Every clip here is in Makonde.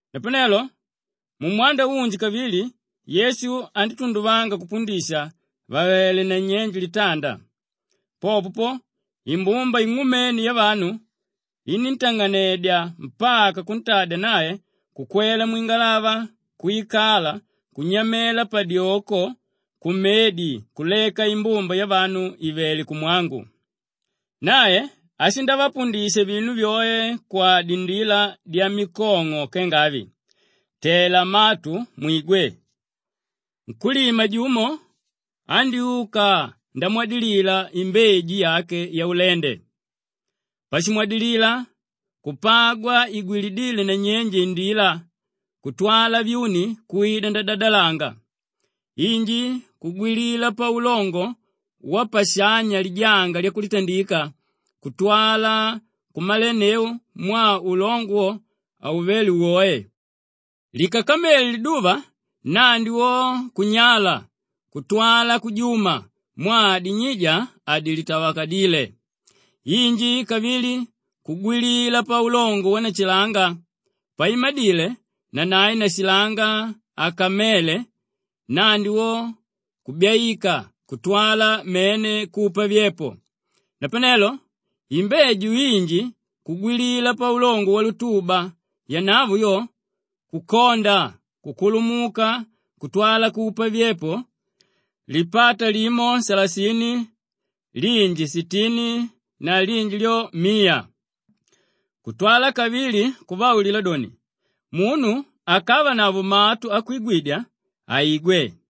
Napanelo mumwanda unji kavili Yesu andítunduvanga kupundisha àvele nanyenje litanda. Popo po, imbumba ing'umene yavanu iníntang'anedya mpaka kuntadya nae kukwela mwingalava kwikala kunyamela padyoko kumedi kuleka imbumba yavanu ìvele kumwangu. Nae ashindavapundisha vinu vyoe kwadindila dyamikong'o kenga avi, “Tela matu mwigwe! Nkúlima jumo andyúka ndamwadilila imbeju yake yaulende. Pashimwadilila, kupagwa igwilidile nanyenje indila kutwala vyuni kwida ndadadalanga. Inji kugwilila paulongo wapashanya lijanga lyakulitandika kutwala kumalenneu mwaa ulongo wo hauvéle woe. Likakamele liduva nnandi wo kunyala kutwala kujuma mwaa dinyija hadilitavalakadíle. Inji kavili kugwilila paulongo wanashilanga, paimadile nanae nashilanga akamele nnandi wo kubyaika kutwala mene kupa vyepo. Napanelo imbeju inji kugwilila paulongo walutuba, yanavo yo kukonda kukulumuka kutwala kupa vyepo, lipata limo salasini, linji sitini na linji lyo miya.” Kutwala kavili kuvaulila doni, “Munu akavanavo matu akwigwidya, aigwe!”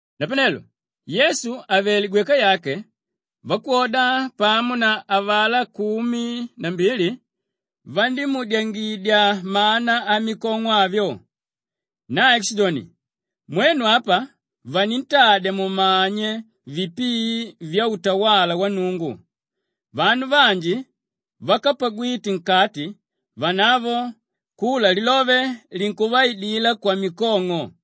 Napanelo Yesu àvele gweka yake, vakwoda pamo na avalá kumi na mbili vandímuudyangidya mana amikong'o avyo. Nae kushidoni, “Mwenu apa vanintadya mumanye vipii vyautawala wa Nnungu, vanu vanji vákapagwite nkati, vanavo kula lilove linkuvaidila kwamikong'o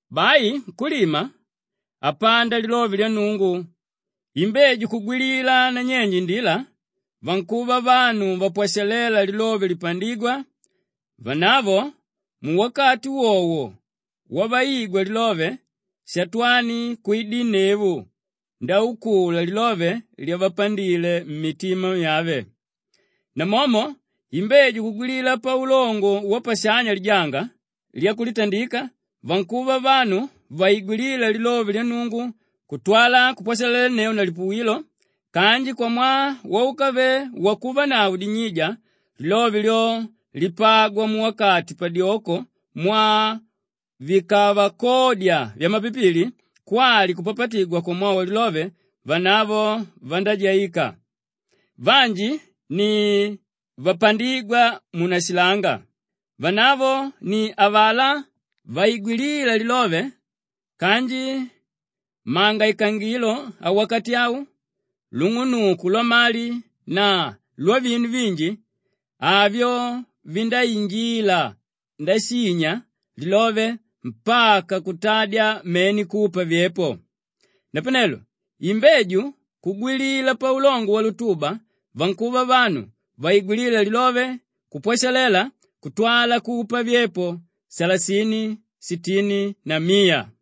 Bai nkúlima, apanda lilove lya Nnungu. Imbeju kugwilila nanyenje indila, vankuva vanu vapwashaléla lilove lipandígwa; vanavo muwakati wowo wavaigwa lilove, Shatwani kwidinneu ndaukula lilove lyavapandile mmitima myave. Namomo imbeju kugwilila paulongo wapashanya lijanga lyakulitandika, vankuva vanu vaigwilíla lilove lya Nnungu kutwala kupwashalalenneu na lipuwilo kanji kwamwaa úkave wakuvanavo dinyija, lilove lyo lipagwa muwakati padyoko mwaa vikavakodya vyamapipili kwali kupapatigwa kwamwaa walilove, vanavo vandájaika. Vanji ni vapandígwa munashilanga. Vanavo ni avalá vaigwilíla lilove kanji mangaikangilo awakati au, lung'unuku lwamali na lwavinu vinji, avyo vindáinjila ndashinya lilove mpaka kutadya mene kupa vyepo. Napanelo imbeju kugwilila paulongo walutuba, vankuva vanu vaigwilíla lilove kupwashalela kutwala kupa vyepo salasini, sitini na miya.”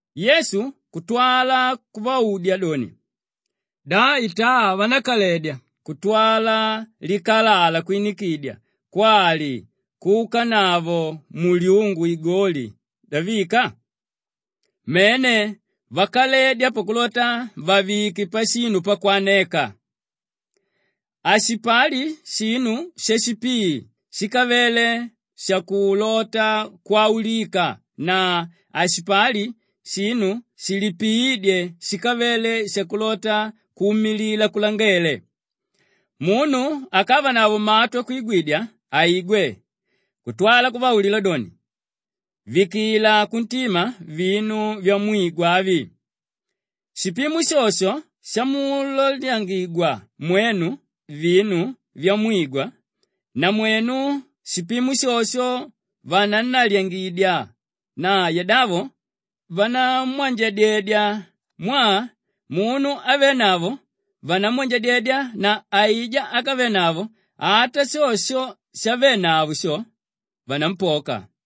Yesu kutwala kuvaudya doni, “Da itaa vanákaledya kutwala likalala kwinikidya kwali kuukanavo mulyungu igoli ndavika? Mene! Vakaledya pakulota vavike pashinu pakwaneka. Hashipali shinu shashipii shíkavele shakulota kwaulika na hashipali shinu shilipiídye shíkavele shakulota kuumilila kulangele. Munu akavanavo matu akwigwidya, aigwe.” Kutwala kuvaulila doni, “Vikila kuntima vinu vyamwigwa avi! Shipimo shosho shamulalyangidya mwenu vinu vyamwigwa, namwenu shipimo shosho vanannalyangidya na yadavo vanamwanjadyedya mwaa munu ávenavo vanamwanjadyedya na aijá ákavenavo ata sho shavenavo sho, vanampoka.”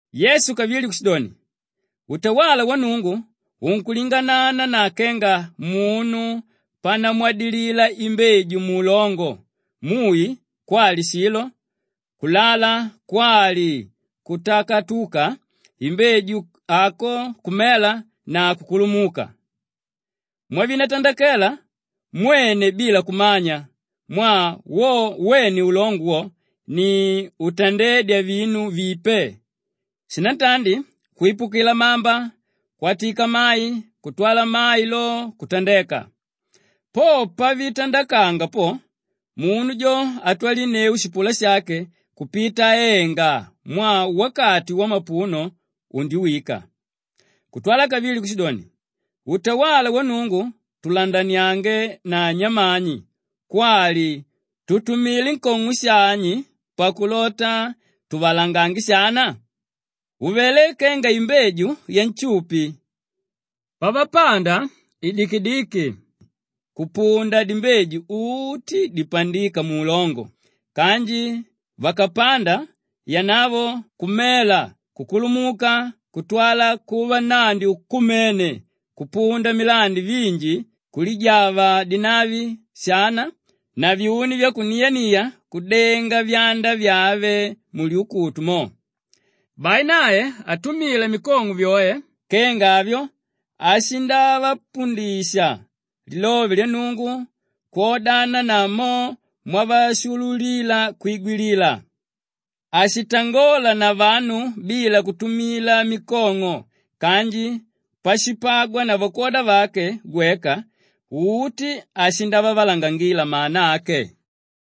Yesu kavili kushidoni, “Utawala wa Nnungu unkulinganana na kenga munu panamwadilila imbeju muulongo; mui kwali shilo kulala kwali kutakatuka imbeju ako kumela na kukulumuka. Mwavitandakela mwene bila kumanya mwaa wo wene ulongo wo ni útandedya vinu vipe; shinantandi kwipukila mamba kwatika mai kutwala mai lo kutandeka. Po pavitandakanga po, munu jo atwalinneu shipula shake kupita aenga mwaa wakati wamapuno undiwika.” Kutwala kavili kushidoni, “Utawala wa Nnungu tulandaniange na nyamani kwali tutumile nkong'o shani pakulota tuvalangange shana? Uvelé kenga imbeju yanshupi; pavapanda idikidiki kupunda dimbeju uti dipandíka muulongo kanji vakapanda yanavo kumela kukulumuka kutwala kuva nnandi ukumene kupunda milandi vinji kulijava dinavi shana na vyuni vyakuniania kudenga vyanda vyave mulyuku mo.” Bai nae atumila mikong'o vyoe kenga avyo ashindapundisha lilove lya Nnungu kwodana na mo mwavashuululila kwigwilila. Hashitangola na vanu bila kutumila mikong'o kanji pashipagwa na vakwoda vake gweka uti ashindavavalangangila mana ake.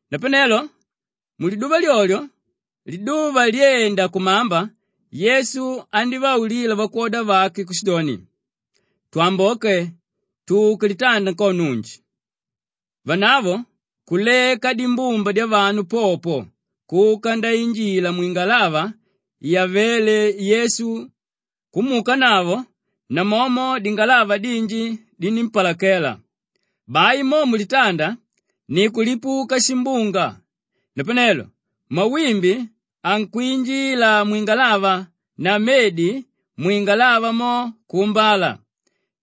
Napanelo muliduva lyolyo liduva lyenda kukudimba Yesu andívaulila vakwoda vake kushidoni, “Twamboke tuke litanda nkono unji.” Vanavo kuleka dimbumba dyavanu popo kuka ndainjila mwingalava yavéle Yesu kumuukanavo; namomo dingalava dinji dinímpalakela. Bai mo mulitanda ni kulipuka shimbunga, napanelo mawimbi ankwinjila mwingalava na medi mwingalava mo kuumbala.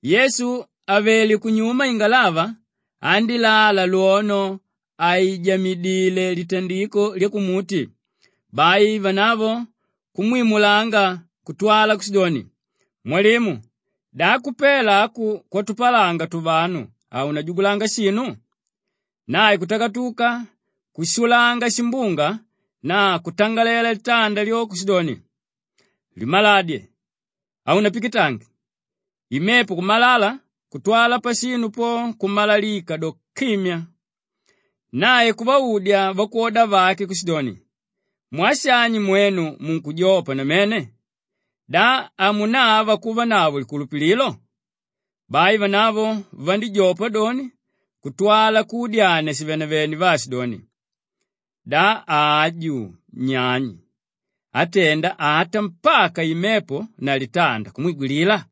Yesu avele kunyuma ingalava andílala lwono àijamidile litandiko lyakumuti. Bai vanavo kumwimulanga kutwala kushidoni, “Mwalimu, da kupela aku kwatupalanga tuvanu, haunajugulanga shinu?” Nae akatakatuka kushulanga shimbunga na kutangalela litanda lyo kushidoni, “Limaladye! Haunapikitange!” Imepo kumalala kutwala pashinu po kumalalika do, kimyaa! Nae kuvaudya vakwoda vake kushidoni, “Mwaa shani mwenu munkujopa namene? Da hamunava kuvanavo likulupililo?” Bai vanavo vandíjopa doni kutwala kuudyania shivenevene vaashidoni, “Da aju nyani átenda ata mpaka imepo na litanda kumwigwilila?”